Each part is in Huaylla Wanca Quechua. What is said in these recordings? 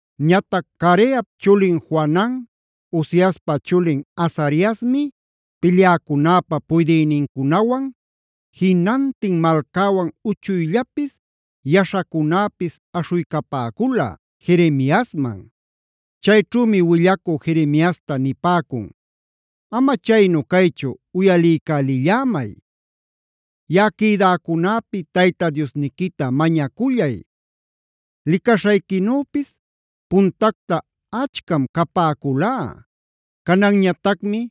Ñatac Careap chulin Johanan, Osaiaspa chulin Azariasmi pilyäcunäpa puydïnincunawan, jinantin malcäwan uchuyllapis yaśhacunäpis aśhuycapäcula Jeremiasman. Chayćhümi willacü Jeremiasta nipäcun: “Ama chaynu caychu uyaliycälillämay. Yaꞌa quïdäcunäpi Tayta Diosniquita mañacullay. Licaśhayquinüpis puntacta achcam capäculá; cananñatacmi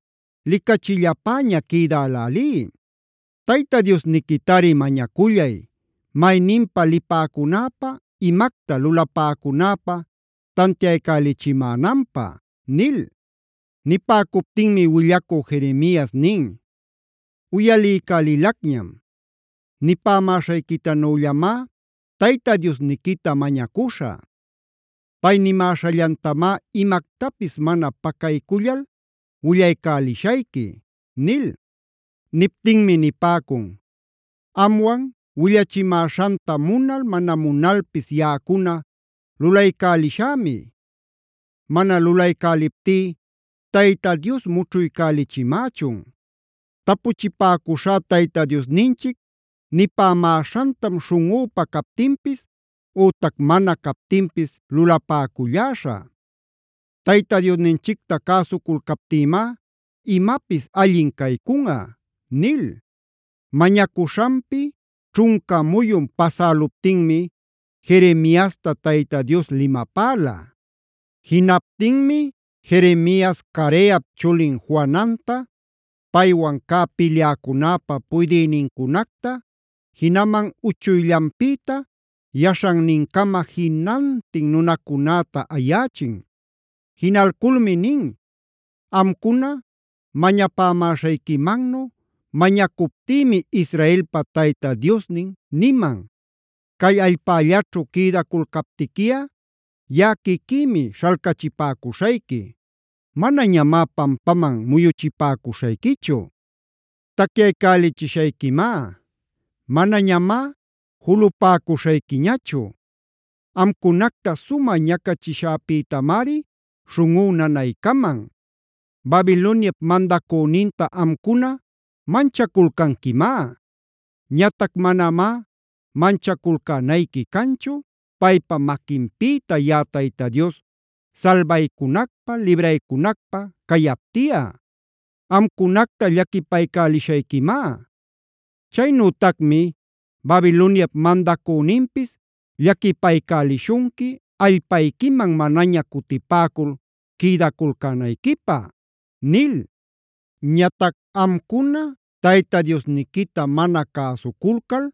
licachillapäña quïdälälí. Tayta Diosniquitari mañacullay, mayninpa lipäcunäpä, imacta lulapäcunäpä tantiaycälichimänanpä” nil. Nipäcuptinmi willacü Jeremias nin: “Uyaliycälicñam. Nipämäśhayquitanüllamá Tayta Diosniquita mañacuśhä. Pay nimäśhallantamá imactapis mana pacaycullal willaycälishayqui” nil. Niptinmi nipäcun: “Amwan willachimäśhanta munal mana munalpis yaꞌacuna lulaycälishämi; mana lulaycäliptí Tayta Dios mućhuycälichimächun. Tapuchipäcuśhá Tayta Diosninchic nipämäśhantam śhunꞌüpä captinpis ütac mana captinpis lulapäculläśhä. Tayta Diosninchicta cäsuculcaptïmá imapis allin caycunꞌa” nil. Mañacuśhanpi ćhunca muyun pasäluptinmi Jeremiasta Tayta Dios limapäla. Jinaptinmi Jeremias Careap chulin Johananta, paywan cä pilyäcunäpa puydïnincunacta, jinaman uchuyllanpïta yaśhannincama jinantin nunacunäta ayächin. Jinalculmi nin: “Amcuna mañapämäśhayquimannu mañacuptïmi Israelpa Tayta Diosnin niman: ‘Cay allpällaćhu quïdaculcaptiquiꞌa yaꞌa quiquïmi śhalcachipäcuśhayqui; manañamá pampaman muyuchipäcuśhayquichu. Tacyaycälichishayquimá; manañamá julupäcuśhayquiñachu. Amcunacta sumä ñacachiśhäpïtamari śhunꞌú nanaycaman. Babiloniap mandacüninta amcuna manchaculcanquimá. Ñatac manamá manchaculcänayqui canchu, paypa maquinpïta yaꞌa Tayta Dios salbaycunacpä, libraycunacpä cayaptiꞌa. Amcunacta llaquipaycälishayquimá. Chaynütacmi Babiloniap mandacüninpis llaquipaycälishunqui allpayquiman manaña cutipäcul quïdaculcänayquipä’ nil. “Ñatac amcuna Tayta Diosniquita mana cäsuculcal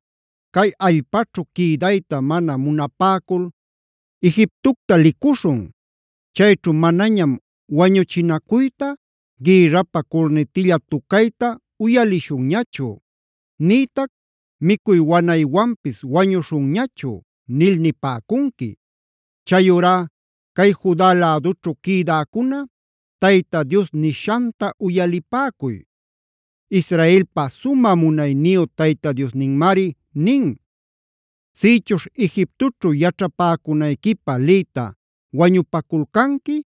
cay allpaćhu quïdayta mana munapäcul: ‘Egiptocta licuśhun. Chayćhu manañam wañuchinacuyta, gïrrapä curnitilla tucayta uyalishunñachu, nïtac micuy wanaywanpis wañuśhunñachu’ nil nipäcunqui. Chayurá cay Juda lädućhu quïdäcuna Tayta Dios nishanta uyalipäcuy. Israelpa sumä munayniyu Tayta Diosninmari nin: ‘Sïchuśh Egiptoćhu yaćhapäcunayquipä liyta wañupaculcanqui,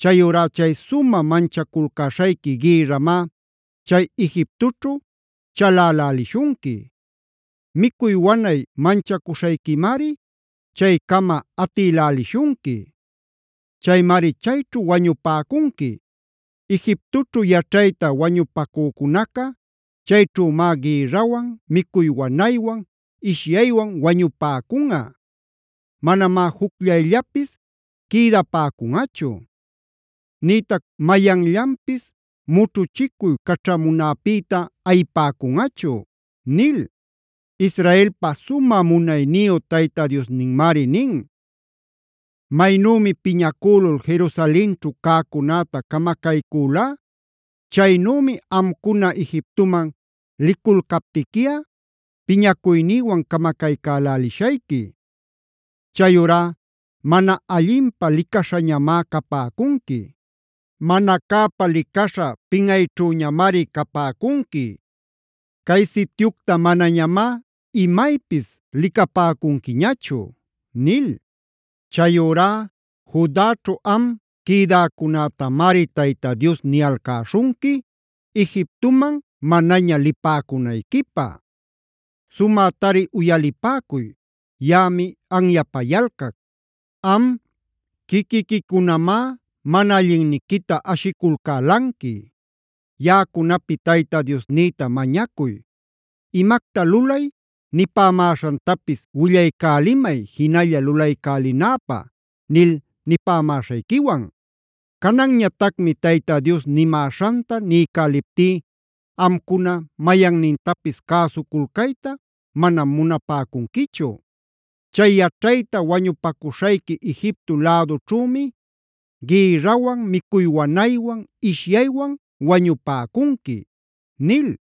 chayurá chay sumä manchaculcäśhayqui gïrramá chay Egiptoćhu chalälälishunqui; micuy wanay manchacuśhayquimari chaycama atïlälishunqui. Chaymari chayćhu wañupäcunqui. Egiptoćhu yaćhayta wañupacücunaca chayćhümá gïrrawan, micuy wanaywan, ishyaywan wañupäcunꞌa. Manamá jucllayllapis quïdapäcunꞌachu; nïtac mayanllapis mućhuchicuy caćhamunäpïta ayipäcunꞌachu’ nil. “Israelpa sumä munayniyu Tayta Diosninmari nin: ‘Maynümi piñacülul Jerusalenćhu cäcunäta camacaycülá, chaynümi amcuna Egiptoman liculcaptiquiꞌa piñacuynïwan camacaycälälishayqui. Chayurá mana allinpä licaśhañamá capäcunqui; mana cäpä licaśha pinꞌayćhüñamari capäcunqui. Cay sityucta manañamá imaypis licapäcunquiñachu’ nil. “Chayurá Judaćhu am quïdäcunätamari Tayta Dios niyalcäśhunqui Egiptoman manaña lipäcunayquipä. Sumätari uyalipäcuy, yaꞌami anyapayalcac. Am quiquiquicunamá mana allinniquita ashiculcälanqui: ‘Yaꞌacunapi Tayta Diosnïta mañacuy. Imacta lulay nipämäśhantapis willaycälimay jinalla lulaycälinäpä’ nil nipämäśhayquiwan. Cananñatacmi Tayta Dios nimäśhanta niycäliptí amcuna mayannintapis cäsuculcayta mana munapäcunquichu. Chay yaćhayta wañupacuśhayqui Egipto lädućhümi gïrrawan, micuy wanaywan, ishyaywan wañupäcunqui” nil.